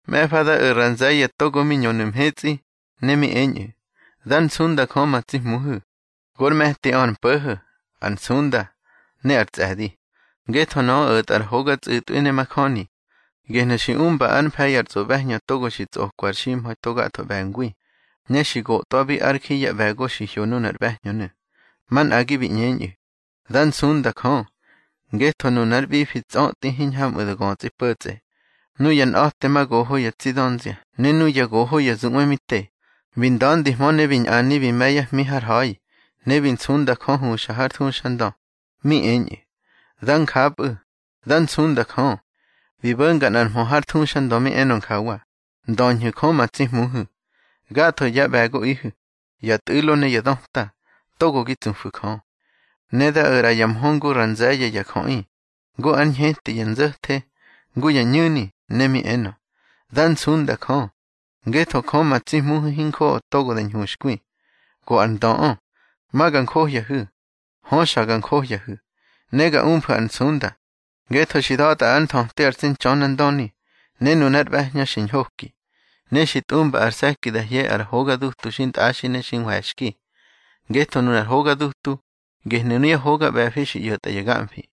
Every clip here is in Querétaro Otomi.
Mꞌe̱fa da o̱ ra nze̱ye̱ togo mi ñönu̱ mhetsꞌi, ne mi eñꞌu̱: Dár nsunda Jö ma tsi Hmuhu̱. Gor me̱tiꞌö ar mpo̱ho̱, ar nsunda, ne ar tsꞌe̱di. Ngetho nöꞌö o̱tꞌa ar hoga tsꞌu̱tꞌwi ne majöni. Gehnu̱ xi umba ár mfe̱i ar tsꞌoꞌbe̱hñö togo xi tsꞌotꞌa ar ximha̱i to gatho ꞌbe̱ngwi, ne xi gotꞌwabi ár ji yá ꞌbe̱go xi hyo nunar ꞌbe̱hñönu̱. Manꞌagi bi ꞌñeñꞌu̱: —Dá nsunda Jö, ngetho nunár ꞌbifi tsötꞌi, hiñhamꞌu̱ da götsꞌi po̱tsꞌe. Nuya nꞌa̱temagoho ya tsi dönzia ne nuya goho ya zuꞌwe mi te, bi nda̱ndihmö ne bi ñꞌani bi me̱ yá hmi har ha̱i. Ne bi nsunda Jö huxa har thuxandö, mi eñꞌu̱: —Dá njapꞌu̱, dá nsunda Jö. Bi bo̱nga nꞌar mhö har thuxandö mi enö njawa: Ndöñhu̱ Jö ma tsi Hmuhu̱, gatho yá ꞌbe̱goꞌihu̱, ya tꞌu̱lo ne ya döta, togo gi tsufu̱ Jö. Ne da o̱ ꞌra ya mhö ngu ra nze̱ye̱ ya jöꞌi, ngu ár ñheti ya nzo̱the, ngu ya ñu̱ni, ne mi enö: Dá nsunda Jö, ngetho Jö ma tsi Hmuhu̱ hinjoꞌo togo da hñuxkwi, go ar ndöꞌö. Ma ga njohyahu̱, hö xa ga njohyahu̱, ne ga umfu̱ ar nsunda, ngetho xi da̱tꞌa ár nthöti ar tsi Ntxönandöni, ne nunár ꞌbe̱hñö xi ñhoki. Ne xi tꞌumba ar se̱ki da hye ya hoga dutu xintꞌaxi ne xi nhwe̱xki. Ngetho nunar hoga dutu, gehnu̱ nuyá hoga ꞌbe̱fi xi ꞌyo̱tꞌa ya gamfi.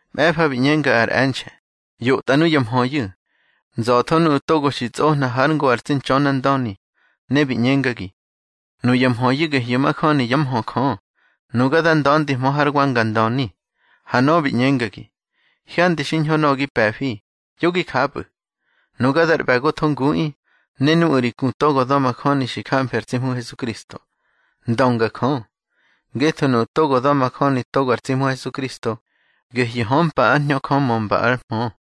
Mꞌe̱fa bi ꞌñenga ar e̱nxe̱: —ꞌYotꞌa nuya mhöyu̱: Nza̱tho nuꞌu̱ togo xi tsꞌohna hár ngo ar tsi Ntxönandöni. Ne bi ꞌñengagi: —Nuya mhöyu̱ gehyu̱ majöni yá mhö Jö. Nuga da nda̱ndihmö hár wa nga ndöni. Ha nöꞌö bi ꞌñengagi: —Hyandi xiñho nöꞌö gi pe̱fi, yo gi japꞌu̱. Nuga dar ꞌbe̱gotho nguꞌi, ne nuꞌu̱ ri ku togo da̱majöni xi jamfi ar tsi Hmu Hesukristo. Ndönga Jö. Ngetho nuꞌu̱ togo da̱majöni togo ar tsi Hmu Hesukristo, gehyu̱ hömpa ár Hñö Jö mömba ár mhö.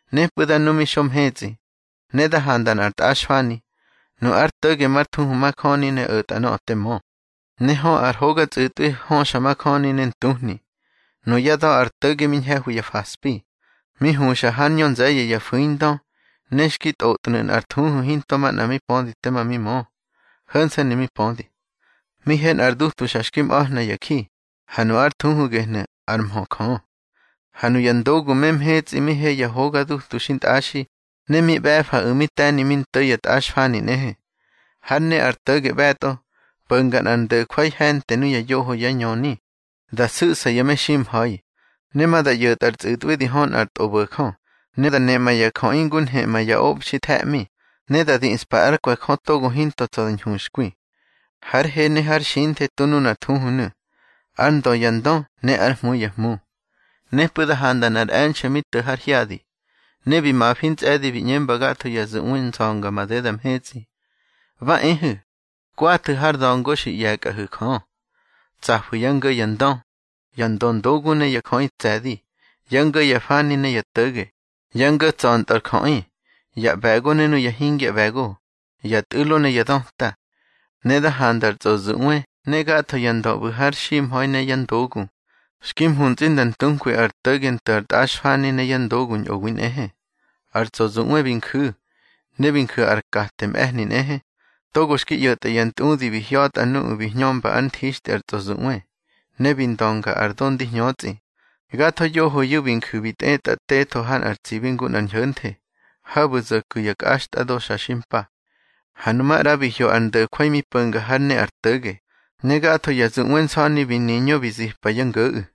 Nepꞌu̱ da nu mi xo mhetsꞌi, ne da handa nꞌar tꞌaxfani. Nu ár to̱ge mar thuhu Majöni ne o̱tꞌa nöꞌö te mö, ne hö ar hoga tsꞌu̱tꞌwi höxa majöni ne ntuhni. Nuyá da̱ ar to̱ge mi ñhe̱hwi ya faspi. Mi huxa hár ñö nze̱ye̱ ya fu̱indö, ne xki tꞌotnu̱ nꞌar thuhu hinto manꞌa mi pödi tema mi mö, ho̱nse̱nu̱ mi pödi. Mi he nꞌar dutu xa xki mꞌahna ya ji, ha nu ár thuhu gehnu̱: ÁR MHÖ JÖ. Ha nuya ndogu me mhetsꞌi mi he ya hoga dutu xintꞌaxi, ne mi ꞌbe̱faꞌu̱ mi te̱ni mi nto̱ ya tꞌaxfani nꞌehe. Hár ne ar to̱ge ꞌbe̱tꞌo, po̱nga nꞌar ndo̱jwai he̱nte nuya yoho yá ñöni, da su̱ꞌsa ya meximha̱i. Ne ma da ꞌyo̱tꞌa ar tsꞌu̱tꞌwi di hö nꞌar tꞌobo̱jö. Ne da neꞌma ya jöꞌi ngu nheꞌma ya obxi the̱ꞌmi, ne da diꞌspa ár kwe̱ Jö togo hinto tsa̱ da ñhuxkwi. Hár he ne hár xinthe tu nunar thuhunu̱: ÁR NDÖ YA NDÖ NE ÁR HMU YA HMU. Nepꞌu̱ da handa nꞌar e̱nxe̱ mi to̱ har hyadi, ne bi mafi ntsꞌe̱di bi ꞌñemba gatho ya zuꞌwe nsa̱nga madeda mhetsꞌi: —Ba ehu̱, kwathu̱ har da̱ngo xi ꞌye̱kꞌahu̱ Jö. Tsafu̱ yá ngo̱ ya ndö, ya ndöndogu ne ya jöꞌi tse̱di, yá ngo̱ ya fani ne yá to̱ge, yá ngo̱ tsa̱ntꞌö ar jöꞌi, ya ꞌbe̱go ne nuya hingya ꞌbe̱go, ya tꞌu̱lo ne ya döta. Ne da handa ar tsꞌozuꞌwe ne gatho ya ndö ꞌbu̱ har ximha̱i ne yá ndogu, xki mhuntsꞌi nda ntunkwi ar to̱ge nto̱ ar tꞌaxfani ne yá ndogu ñꞌowi nꞌehe. Ar tsꞌozuꞌwe bi nju̱, ne bi nju̱ ar kate mꞌe̱hni nꞌehe, togo xki ꞌyo̱tꞌa ya ntꞌudi bi hya̱tꞌa nuꞌu̱ bi hñömba ár nthixtꞌi ar tsꞌozuꞌwe, ne bi ndönga ar do ndi hñötsꞌi. Gatho yohoyu̱ bi nju̱ bi tꞌetꞌa tetho ha nꞌar tsibi ngu nꞌar ñho̱nthe, habu̱ zo̱ ku̱ ya kꞌaxtꞌado xa xi mpa. Ha nu maꞌra bi hyo ar ndo̱jwai mi po̱nga hár ne ar to̱ge, ne gatho ya zuꞌwe nsa̱ni bi niñö bi zipa yá ngo̱ꞌu̱.